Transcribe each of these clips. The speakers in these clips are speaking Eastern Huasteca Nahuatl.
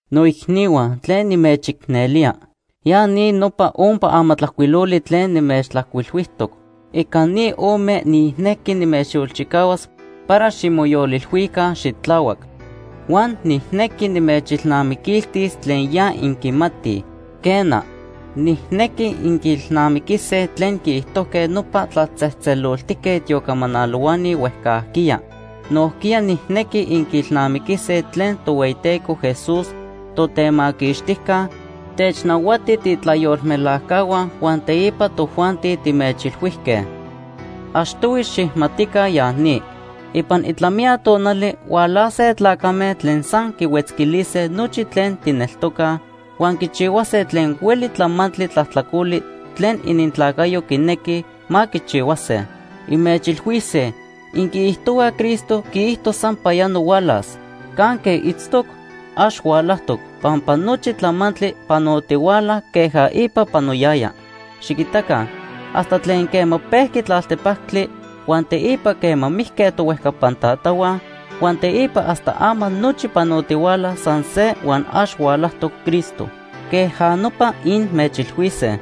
Noicnihua tlen nimechicnelía, ya ni nopa ompa amatlajcuiloli tlen nimechtlajcuilhuijtoc. Ica ni ome nijnequi nimechyolchicahuas para ximoyolilhuica xitlahuac. Huan nijnequi nimechilnamiquiltis tlen ya inquimatij. Quena, nijnequi inquiilnamiquise tlen quiijtojque nopa tlatzejtzeloltique tiocamanalohuani huejcajquiya. Nojquiya nijnequi inquiilnamiquise tlen Tohueyiteco Jesús, Totemaquixtijca, technahuati tiitlayolmelajcahua huan teipa tojuanti timechilhuijque. Achtohui xijmatica ya ni. Ipan itlamiya tonali hualase tlacame tlen san quihuetzquilise nochi tlen tijneltocaj, huan quichihuase tlen hueli tlamantli tlajtlacoli tlen inintlacayo quinequij ma quichihuase. Inmechilhuise: “Inquiijtohuaj Cristo quiijto sampayano hualas. ¿Canque itztoc? Ax hualajtoc. Pampa nochi tlamantli panotihuala queja ipa panoyaya. Xiquitaca hasta tlen quema pejqui tlaltepactli, huan teipa quema mijque tohuejcapan tatahua, huan teipa hasta ama nochi panotihuala san se huan ax hualajtoc Cristo.” Queja nopa inmechilhuise.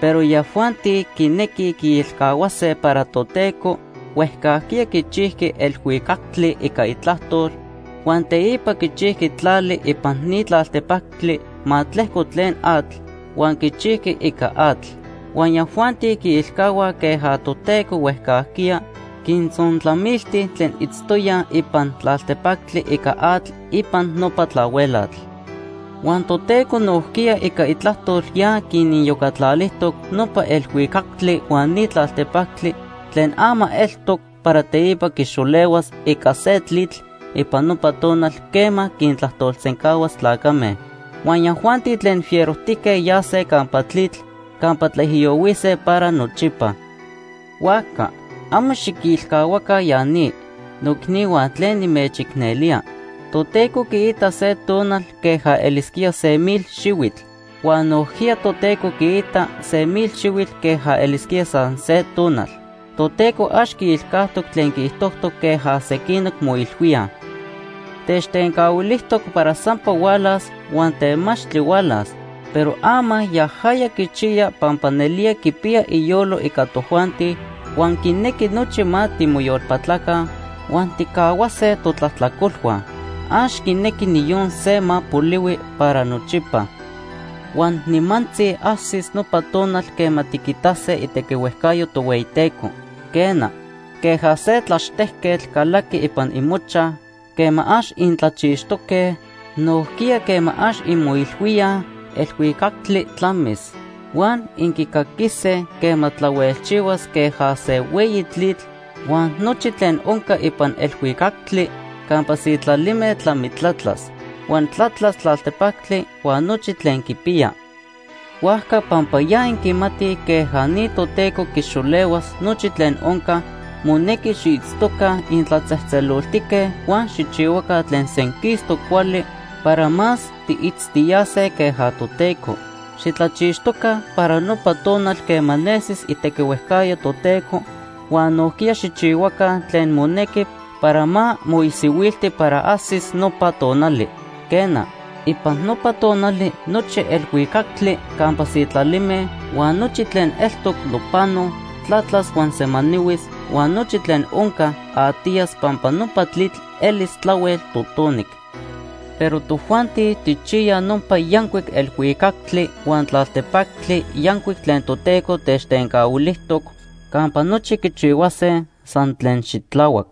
Pero yajuanti quinequij quiilcahuase para Toteco huejcajquiya quichijqui elhuicactli ica itlajtol, huan teipa quichijqui tlali ipan ni tlaltepactli ma tlejco tlen atl, huan quichijqui ica atl. Huan yajuanti quiilcahuaj queja Toteco huejcajquiya quintzontlamilti tlen itztoyaj ipan tlaltepactli ica atl ipan nopa tlahuelatl. Huan Toteco nojquiya ica itlajtol ya quiniyocatlalijtoc nopa elhuicactli huan ni tlaltepactli tlen ama eltoc para teipa quixolehuas ica se tlitl ipan nopa tonal quema quintlajtolsencahuas tlacame. Huan yajuanti tlen fierojtique yase campa tlitl campa tlaijiyohuise para nochipa. Huajca amo xiquilcahuaca ya ni, noicnihua tlen nimechicnelía: Toteco quiita se tonal queja elisquía se mil xihuitl. Huan nojquiya Toteco quiita se mil xihuitl queja elisquía san se tonal. Toteco ax quiilcajtoc tlen quiijtojtoc queja sequin moilhuíaj. Techtencahuilijtoc para sampa hualas, huan temachtli hualas. Pero ama yajaya quichiya pampa nelía quipiya iyolo ica tojuanti huan quinequi nochi ma timoyolpatlaca huan tijcahuase totlajtlacolhua. Ax quinequi niyon se ma polihui para nochipa. Huan nimantzi ajsis nopa tonal quema tiquitase itequihuejcayo Tohueyiteco. Quena, queja se tlaxtejquetl calaqui ipan imochaj quema ax intlachixtoque, nojquiya quema ax inmoilhuíaj, elhuicactli tlamis. Huan inquicaquise quema tlahuelchihuas queja se hueyi tlitl, huan nochi tlen onca ipan elhuicactli campa sitlalime tlamitlatlas. Huan tlatlas tlaltepactli huan nochi tlen quipiya. Huajca pampa ya inquimatij queja ni Toteco quixolehuas nochi tlen onca, monequi xiitztoca intlatzejtzeloltique huan xijchihuaca tlen senquistoc cuali para más tiitztiyase queja Toteco. Xitlachixtoca para nopa tonal quema nesis itequihuejcayo Toteco huan nojquiya xijchihuaca tlen monequi para ma moisihuilti para ajsis nopa tonali. Quena, ipan nopa tonali nochi elhuicactli campa sitlalime huan nochi tlen eltoc nopano tlatlas huan semanihuis, huan nochi tlen onca atiyas pampa nopa tlitl elis tlahuel totonic. Pero tojuanti tijchiyaj nopa yancuic elhuicactli huan tlaltepactli yancuic tlen Toteco techtencahuilijtoc campa nochi quichihuase san tlen xitlahuac.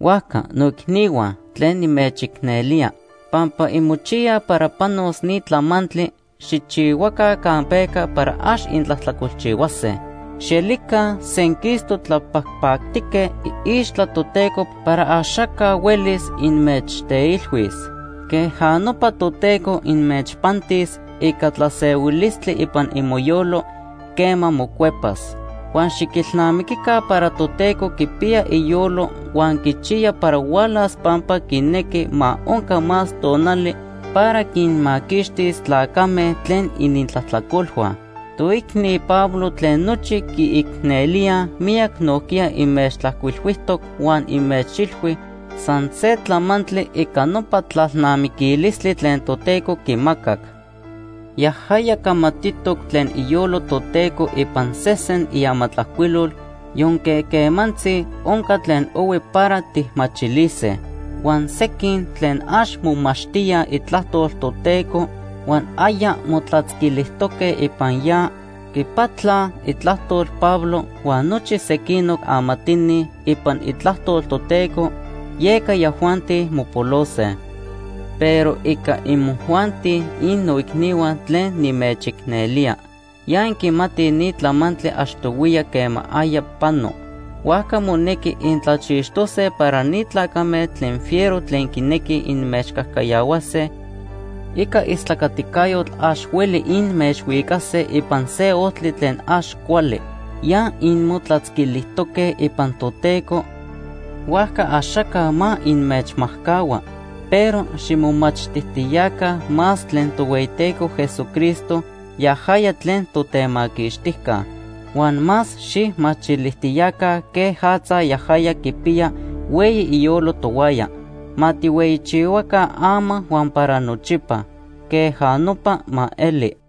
Huajca noicnihua tlen nimechicnelía, pampa inmochiyaj para panos ni tlamantli, xijchihuaca campeca para ax intlajtlacolchihuase. Xielica senquistoc tlapajpactique iixtla Toteco para axaca huelis inmechteilhuis. Queja nopa Toteco inmechpantis ica tlasehuilistli ipan imoyolo quema mocuepas. Huan xiquilnamiquica para Toteco quipiya iyolo huan quichiya para hualas pampa quinequi ma onca más tonali para quinmaquixtis tlacame tlen inintlajtlacolhua. Toicni Pablo tlen nochi quiicnelíaj miyac nojquiya inmechtlajcuilhuijtoc huan inmechilhui san se tlamantli ica nopa tlalnamiquilistli tlen Toteco quimacac. Yajaya camatitoc tlen iyolo Toteco ipan sesen iamatlajcuilol yonque quemantzi onca tlen ohui para tijmachilise. Huan sequin tlen ax momachtíaj Itlajtol Toteco huan aya motlatzquilijtoque ipan ya, quipatlaj itlajtol Pablo huan nochi sequinoc amatini ipan Itlajtol Toteco, yeca yajuanti mopolose. Pero ica imojuanti innoicnihua tlen nimechicnelía, ya inquimatij ni tlamantli achtohuiya quema aya pano. Huajca monequi intlachixtose para ni tlacame tlen fiero tlen quinequij inmechcajcayahuase ica istlacaticayotl ax hueli inmechhuicase ipan se ojtli tlen ax cuali. Ya inmotlatzquilijtoque ipan Toteco, huajca axaca ma inmechmajcahua. Pero ximomachtijtiyaca más tlen Tohueyiteco Jesucristo yajaya tlen Totemaquixtijca. Huan más xijmachilijtiyaca quejatza yajaya quipiya hueyi iyolo tohuaya. Ma tijhueyichihuaca ama huan para nochipa. Queja nopa ma eli.